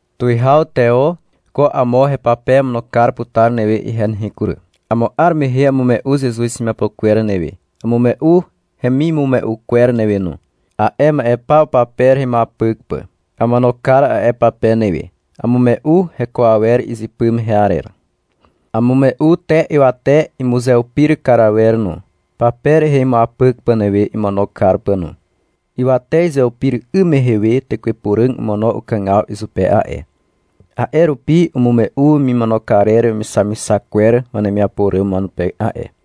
Tuwihaw Teo, ko amo hepape amono kar putar newe ihe nehe kury. Amo 'ar mehe amume'u Zezuz hemiapo kwer newe, amume'u hemimume'u kwer newe no, a'e ma'e paw pape rehe imuapyk pà. Amono kar a'e pape newe. Amume'u heko awer izypy mehe arer. Amume'u te ywate imuzeupir kar awer no, pape rehe imuapyk pà newe imono kar pà no. Ywate izeupir 'ym mehe we Tekwe Puràg omono ukàgaw izupe a'e. A'e rupi umume'u wemimono karer wemixamixak kwer wanemiapo ràm wanupe a'e.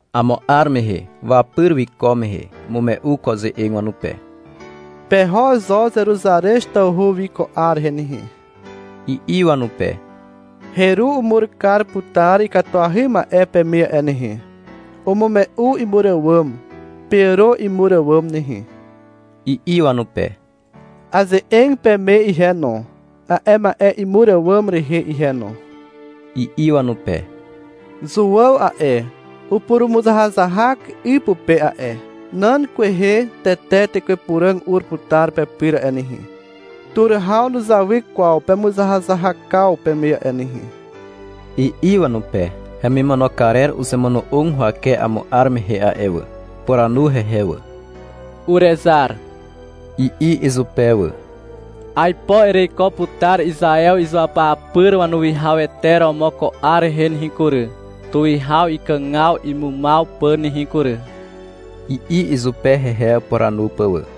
Amo 'ar mehe, wapyr wiko mehe, umume'u ko ze'eg wanupe. — Peho zo Zeruzarez tawhu wi ko 'ar rehe nehe, i'i wanupe. — Heru umur putar ikatuahy ma'e peme a'e nehe. Umume'u imur àwàm. Peàro imur àwàm nehe, i'i wanupe. — Aze'eg peme ihe no, a'e ma'e imur àwàm rehe ihe no, i'i wanupe. — Zuàw a'e, upurumuzahazahak 'y pupe a'e. Nan kwehe tete Tekwe Puràg ur putar pepyr a'e nehe. Tur haw nuzawy kwaw pemuzahazahakaw peme a'e nehe, i'i wanupe. Hemimono karer uzemono'og huwake amo 'ar mehe a'e wà. Upuranu hehe wà. — Urezar, i'i izupe wà. — Aipo ereiko putar Izaew izuapyapyr wanuwihawete romo ko 'ar rehe nehe kury, tuwihaw ikàgaw imumaw pà nehe kury, i'i izupe hehe upuranu pà wà.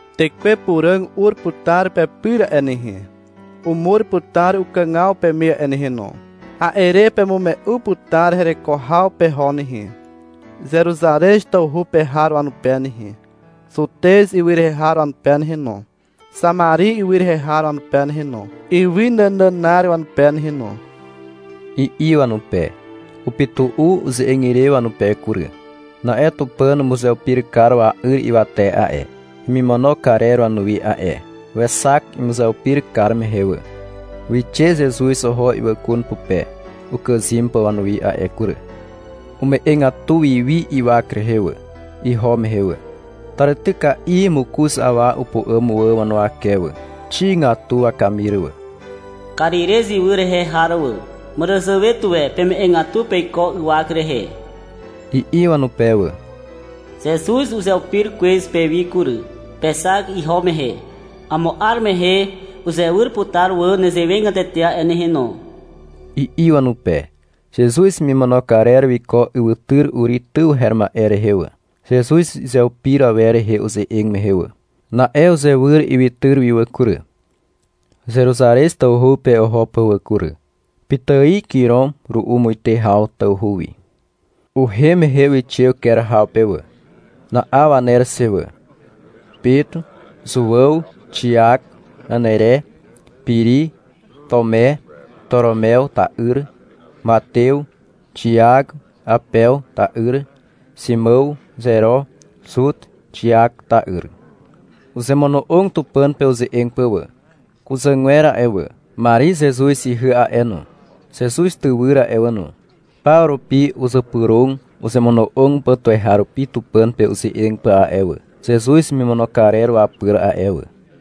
Tekwe Puràg ur putar pepyr a'e nehe. Umur putar ukàgaw peme a'e nehe no. A'e re pemume'u putar hereko haw peho nehe, Zeruzarez tawhu pe har wanupe nehe, Zutez ywy rehe har wanupe nehe no, Xamari ywy rehe har wanupe nehe no, ywy nànànar wanupe nehe no, i'i wanupe. Upytu'u uze'eg ire wanupe kury. Na'e Tupàn umuzeupir kar wa'yr ywate a'e, hemimono karer wanuwi a'e Wexak imuzeupir kar mehe wà. Wixe Zezuz oho ywàkun pupe ukàzym pà wanuwi a'e kury. Ume'egatu wi wi ywak rehe wà, iho mehe wà. Tàrityka'i mokoz awa upu'àm wà wanuwake wà. Xigatu wakamir wà. — Karirez ywy rehe har wà. Màràzàwe tuwe peme'egatu peiko ywak rehe, i'i wanupe wà. — Zezuz uzeupir kwez pewi kury. Pexak iho mehe. Amo 'ar mehe uzewyr putar wà nezewegatete a'e nehe no, i'i wanupe. Zezuz hemimono karer wiko ywytyr Uri tyw her ma'e rehe wà, Zezuz izeupir awer rehe uze'eg mehe wà. Na'e uzewyr ywytyr wi wà kury, Zeruzarez tawhu pe oho pà wà kury. (Pitài kirom ru'u muite haw tawhu wi). Uhem mehe wixe uker haw pe wà. Na'aw waner xe wà: Pet, Zuàw, Xiak, Anere, Piri, Tume, Toromew ta'yr, Matew, Xiak Awpew ta'yr, Ximàw Zero, Zut Xiak ta'yr. Uzemono'og Tupàn pe uze'eg pà wà. Kuzàgwer a'e wà, Mari Zezuz ihy a'e no, Zezuz tywyr a'e wà no, paw rupi uzypyrog uzemono'og pà tuweharupi Tupàn pe uze'eg pà a'e wà, Zezuz hemimono karer wapyr a'e wà.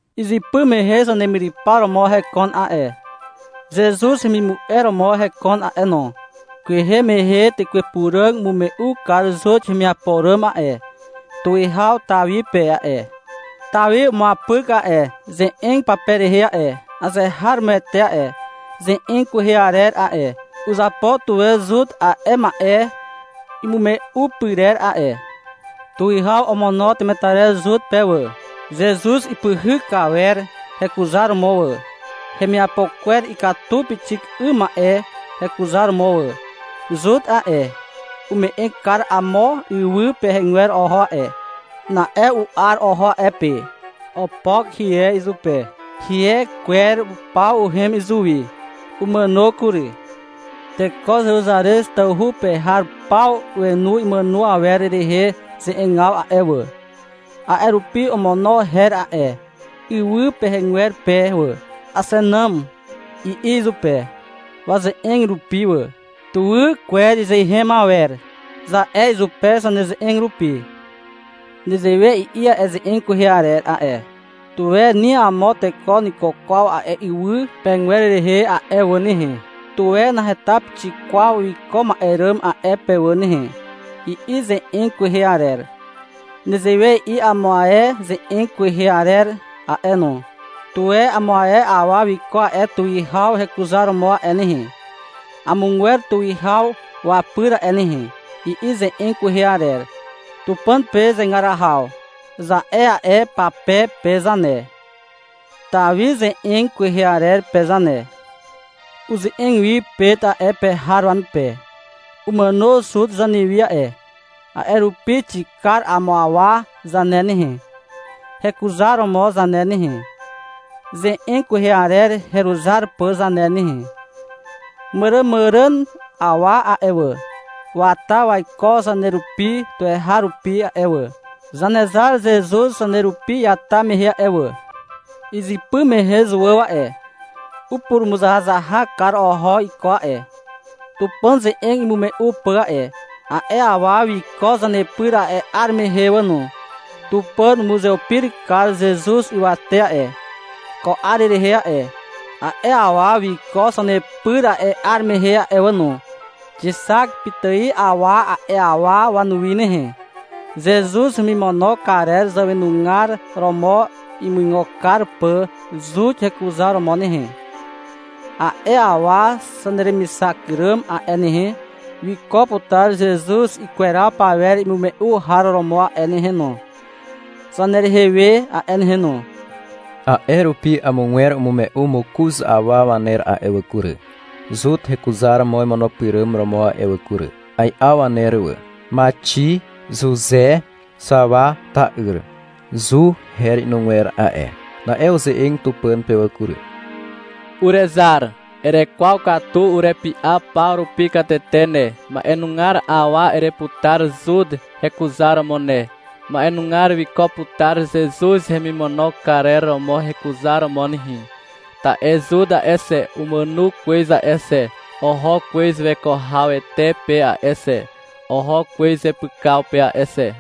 Izypy mehe zanemyrypar romo hekon a'e, Zezuz hemimu'e romo hekon a'e no. Kwehe mehe Tekwe Puràg umume'u kar Zut hemiapo ràm a'e, Tuwihaw Tawi pe a'e. Tawi umuapyk a'e ze'eg pape rehe a'e. Azeharomoete a'e ze'eg kwehe arer a'e. Uzapo tuwe Zut a'e ma'e imume'u pyrer a'e. (Tuwihaw omono temetarer Zut pe wà, Zezuz ipyhyk kar awer hekuzaromo wà, hemiapo kwer ikatu pixik 'ym ma'e hekuzaromo wà. Zut a'e, ume'eg kar amo ywy pegwer oho a'e. Na'e u'ar oho a'e pe. Opok hie izupe. Hie kwer paw uhem izuwi. Umàno kury. Teko Zeruzarez tawhu pe har paw wenu imàno awer rehe ze'egaw a'e wà. A'e rupi omono her a'e ywy pegwer pe wà. — Axenàm, i'i izupe, waze'eg rupi wà. — Tuwy kwer izeen awer, za'e izupe zaneze'eg rupi.) Nezewe i'i a'e ze'eg kwehe arer a'e. — Tuwe ni amo teko nuiko kwaw a'e ywy pegwer rehe a'e wà nehe, Tuwe naheta pixik kwaw wiko ma'e ràm a'e pe wà nehe, i'i ze'eg kwehe arer. Nezewe i'i amo ae ze'eg kwehe arer a'e no. — Tuwe amo ae awa wiko a'e tuwihaw hekuzaromo a'e nehe, Amogwer tuwihaw wapyr a'e nehe, i'i ze'eg kwehe arer. Tupàn pe zegar haw, za'e a'e pape pe zane, (Tawi ze'eg kwehe arer pe zane). (Uze'eg wi Pet a'e pe har wanupe.) Umàno Zut zanewi a'e. A'e rupi xikar amo awa zane nehe, hekuzaromo zane nehe, ze'eg kwehe arer heruzar pà zane nehe. Màràmàràn awa a'e wà, wata waiko zanerupi tuweharupi a'e wà, Zanezar Zezuz zanerupi iata mehe a'e wà. Izypy mehe Zuàw a'e, upurumuzahazahak kar oho iko a'e, Tupàn ze'eg imume'u pà a'e. A'e awa wiko zanepyr a'e 'ar mehe wà no. Tupàn umuzeupir kar Zezuz ywate a'e, ko 'ar rehe a'e. A'e awa wiko zanepyr a'e 'ar mehe a'e wà no. Xixak pitài awa a'e awa wanuwi nehe, Zezuz hemimono karer zàwenugar romo imuigo kar pà Zut hekuzaromo nehe. A'e awa zaneremixak ràm a'e nehe, wiko putar Zezuz ikweraw pawer imume'u har romo a'e nehe no, zanerehe we a'e nehe no. A'e rupi amogwer umume'u mokoz awa waner a'e wà kury, Zut hekuzaromo imono pyràm romo a'e wà kury. Ai'aw waner wà: Maxi, Zuze Xawa ta'yr. (— Zu, her inugwer a'e.) Na'e uze'eg Tupàn pe wà kury. — Urezar. Erekwaw katu urepy'a paw rupi katete ne. Ma'enugar awa ereputar Zut hekuzaromo ne. Ma'enugar wiko putar Zezuz hemimono karer romo hekuzaromo nehe. Ta'e Zut a'e xe, umàno kwez a'e xe. Oho kwez weko hawete pe a'e xe, oho kwez zepykaw pe a'e xe.